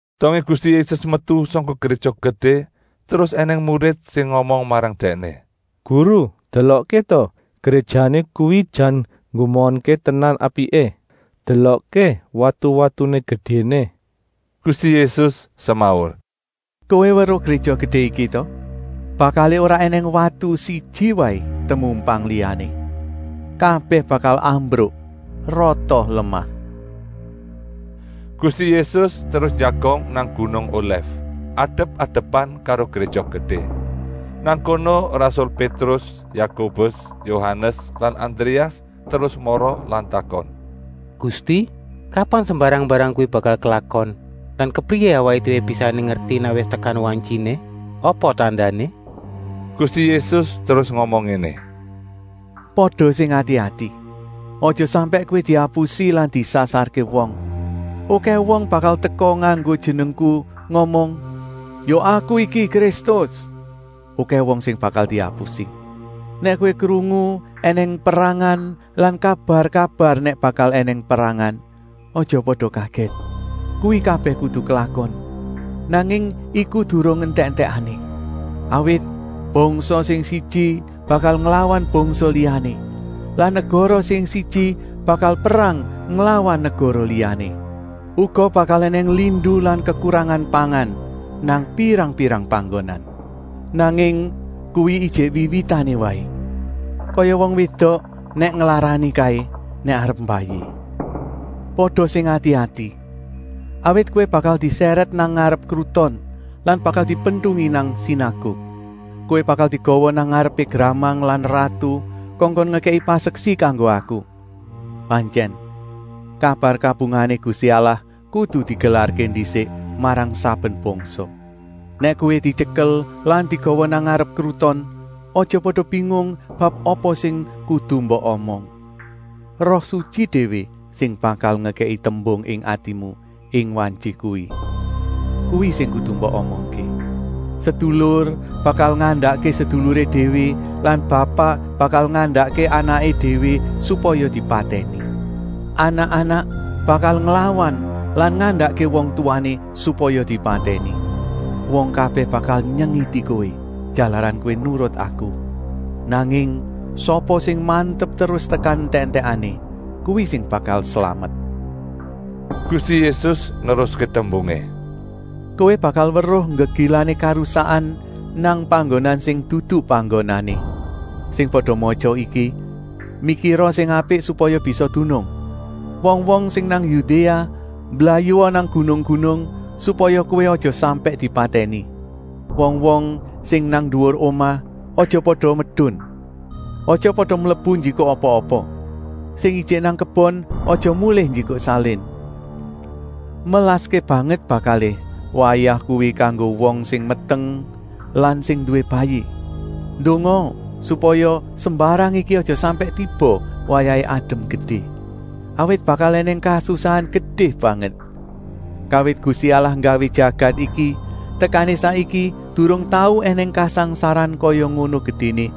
Dongé Gusti Yésus metu sangka Gréja Gedé terus ènèng murid sing ngomong marang Dèkné: “Guru, delokké ta, gréjané kuwi jan nggumunké tenan apiké. Delokké watu-watuné gedéné!” Gusti Yésus semaur: “Kowé weruh Gréja Gedé iki ta? Bakalé ora ènèng watu siji waé temumpang liyané. Kabèh bakal ambruk rata lemah.” Gusti Yésus terus njagong nang gunung Olèf, adep-adepan karo Gréja Gedé. Nang kono rasul Pétrus, Yakobus, Yohanes lan Andréas terus mara lan takon: “Gusti, kapan sembarang-mbarang kuwi bakal klakon lan kepriyé awaké déwé bisané ngerti nèk wis tekan wantyiné? Apa tandané?” Gusti Yésus terus ngomong ngéné: “Pada sing ati-ati. Aja sampèk kowé diapusi lan disasarké wong. Okèh wong bakal teka nganggo jenengku ngomong: ‘Ya aku iki Kristus!’ Okèh wong sing bakal diapusi. Nèk kowé krungu ènèng perangan lan kabar-kabar nèk bakal ènèng perangan, aja pada kagèt. Kuwi kabèh kudu klakon, nanging iku durung entèk-entèkané. Awit bangsa sing siji bakal nglawan bangsa liyané lan negara sing siji bakal perang nglawan negara liyané. Uga bakal ènèng lindu lan kekurangan pangan nang pirang-pirang panggonan. Nanging kuwi ijik wiwitané waé, kaya wong wédok nèk nglarani kaé nèk arep mbayi. “Pada sing ati-ati. Awit kowé bakal disèrèt nang ngarep kruton lan bakal dipentungi nang sinaguk. Kowé bakal digawa nang ngarepé gramang lan ratu kongkon ngekèki paseksi kanggo Aku. Pantyèn, kabar kabungahané Gusti Allah kudu digelarké ndisik marang saben bangsa. Nèk kowé dityekel lan digawa nang ngarep kruton, aja pada bingung bab sing kudu mbok omong; Roh Sutyi déwé sing bakal ngekèki tembung ing atimu ing wantyi kuwi. Kuwi sing kudu mbok omongké. Sedulur bakal ngandakké seduluré déwé lan bapak bakal ngandakké anaké déwé supaya dipatèni. Anak-anak bakal nglawan lan ngandakké wong tuwané supaya dipatèni. Wong kabèh bakal nyengiti kowé jalaran kowé nurut aku. Nanging sapa sing mantep terus tekan entèk-entèkané, kuwi sing bakal slamet.” Gusti Yésus neruské tembungé: “Kowé bakal weruh nggegilané karusakan nang panggonan sing dudu panggonané. (Sing pada matya iki mikira sing apik supaya bisa dunung.) Wong-wong sing nang Yudéa mblayua nang gunung-gunung, supaya kowé aja sampèk dipatèni. Wong-wong sing nang nduwur omah aja pada medun. Aja pada mlebu njikuk apa-apa. Sing ijik nang kebon, aja mulih njikuk salin. Melaské banget bakalé wayah kuwi kanggo wong sing meteng lan sing nduwé bayi. Ndongaa supaya sembarang iki aja sampèk tiba wayahé adem gedé. Awit bakal ènèng kasusahan gedé banget. Kawit Gusti Allah nggawé jagat iki tekané saiki durung tau ènèng kasangsaran kaya ngono gedéné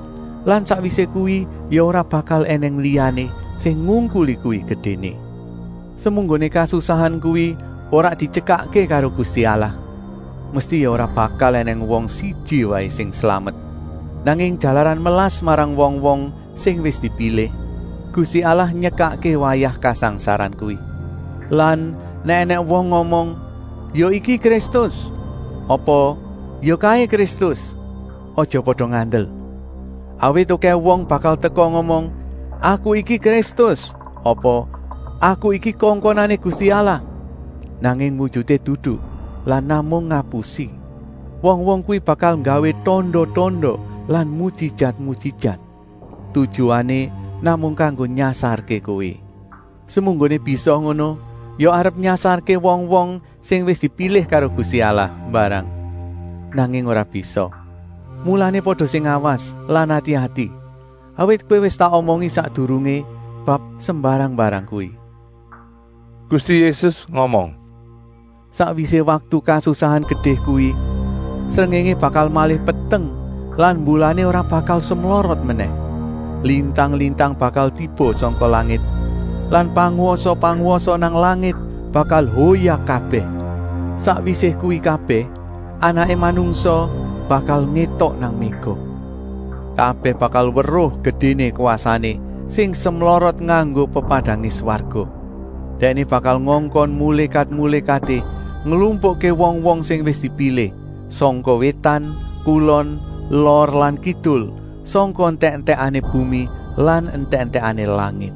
lan sakwisé kuwi ya ora bakal ènèng liyané sing ngungkuli kuwi gedéné. Semunggoné kasusahan kuwi ora dityekakké karo Gusti Allah, mesti ya ora bakal ènèng wong siji waé sing slamet. Nanging jalaran melas marang wong-wong sing wis dipilih, Gusti Allah nyekakké wayah kasangsaran kuwi. “Lan nèk ènèng wong ngomong: ‘Ya iki Kristus,’ apa ‘ya kaé Kristus,’ aja pada ngandel. Awit okèh wong bakal teka ngomong: ‘Aku iki Kristus,’ apa ‘Aku iki kongkonané Gusti Allah,’ nanging wujuté dudu lan namung ngapusi. Wong-wong kuwi bakal nggawé tanda-tanda lan mujijat-mujijat. Tujuané namung kanggo nyasarké kowé. Semunggoné bisa ngono ya arep nyasarké wong-wong sing wis dipilih karo Gusti Allah mbarang. Nanging ora bisa. Mulané pada sing awas lan ati-ati, awit kowé wis tak omongi sakdurungé bab sembarang-mbarang kuwi.” Gusti Yésus ngomong: “Sakwisé waktu kasusahan gedé kuwi, srengéngé bakal malih peteng lan mbulané ora bakal semlorot menèh. Lintang-lintang bakal tiba sangka langit lan pangwasa-pangwasa nang langit bakal hoyak kabèh. Sakwisé kuwi kabèh Anaké Manungsa bakal ngétok nang méga. Kabèh bakal weruh gedéné kwasané sing semlorot nganggo pepadangé swarga. Dèkné bakal ngongkon mulékat-mulékaté nglumpukké wong-wong sing wis dipilih, sangka wétan, kulon, lor lan kidul, sangka entèk-entèkané bumi lan entèk-entèkané langit.”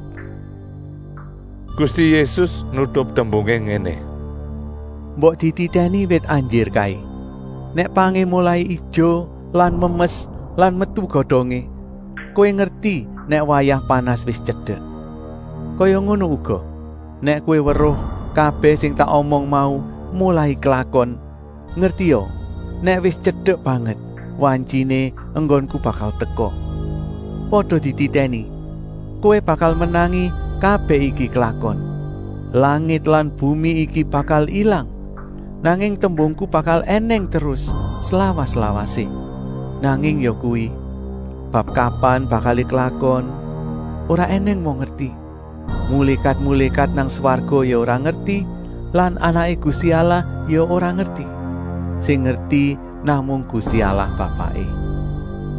Gusti Yésus nutup tembungé ngéné: “Mbok dititèni wit anjir kaé. Nèk pangé molai ijo lan memes lan metu godongé, kowé ngerti nèk wayah panas wis tyedek. Kaya ngono uga, nèk kowé weruh kabèh sing tak omong mau molai klakon, ngertia nèk wis tyedek banget wantyiné enggonku bakal teka. Pada dititèni! Kowé bakal menangi kabèh iki klakon. Langit lan bumi iki bakal ilang, nanging tembungku bakal ènèng terus, slawas-lawasé. “Nanging yakuwi, bab kapan bakalé klakon, ora ènèng wong ngerti. Mulékat-mulékat nang swarga ya ora ngerti lan Anaké Gusti Allah ya ora ngerti. Sing ngerti namung Gusti Allah Bapaké.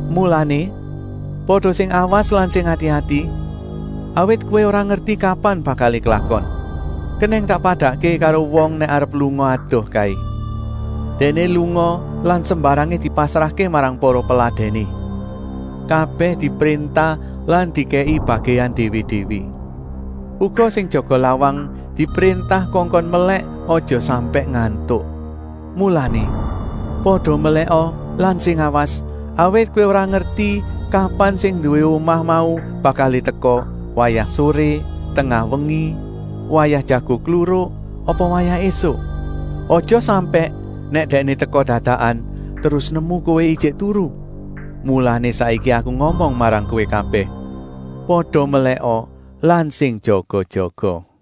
Mulané, pada sing awas lan sing ati-ati, awit kowé ora ngerti kapan bakalé klakon. Kenèng tak padakké karo wong nèk arep lunga adoh kaé. Dèkné lunga lan sembarangé dipasrahké marang para peladèné. Kabèh dipréntah lan dikèki bagèan déwé-déwé. Uga sing jaga lawang dipréntah kongkon melèk aja sampèk ngantuk. Mulané, pada melèka lan sing awas, awit kowé ora ngerti kapan sing nduwé omah mau bakalé teka, wayah soré, tengah wengi, wayah jago kluruk, apa wayah ésuk. Aja sampèk, nèk dèkné teka dadakan, terus nemu kowé ijik turu. Mulané saiki Aku ngomong marang kowé kabèh: ‘Pada melèka lan sing jaga-jaga.’”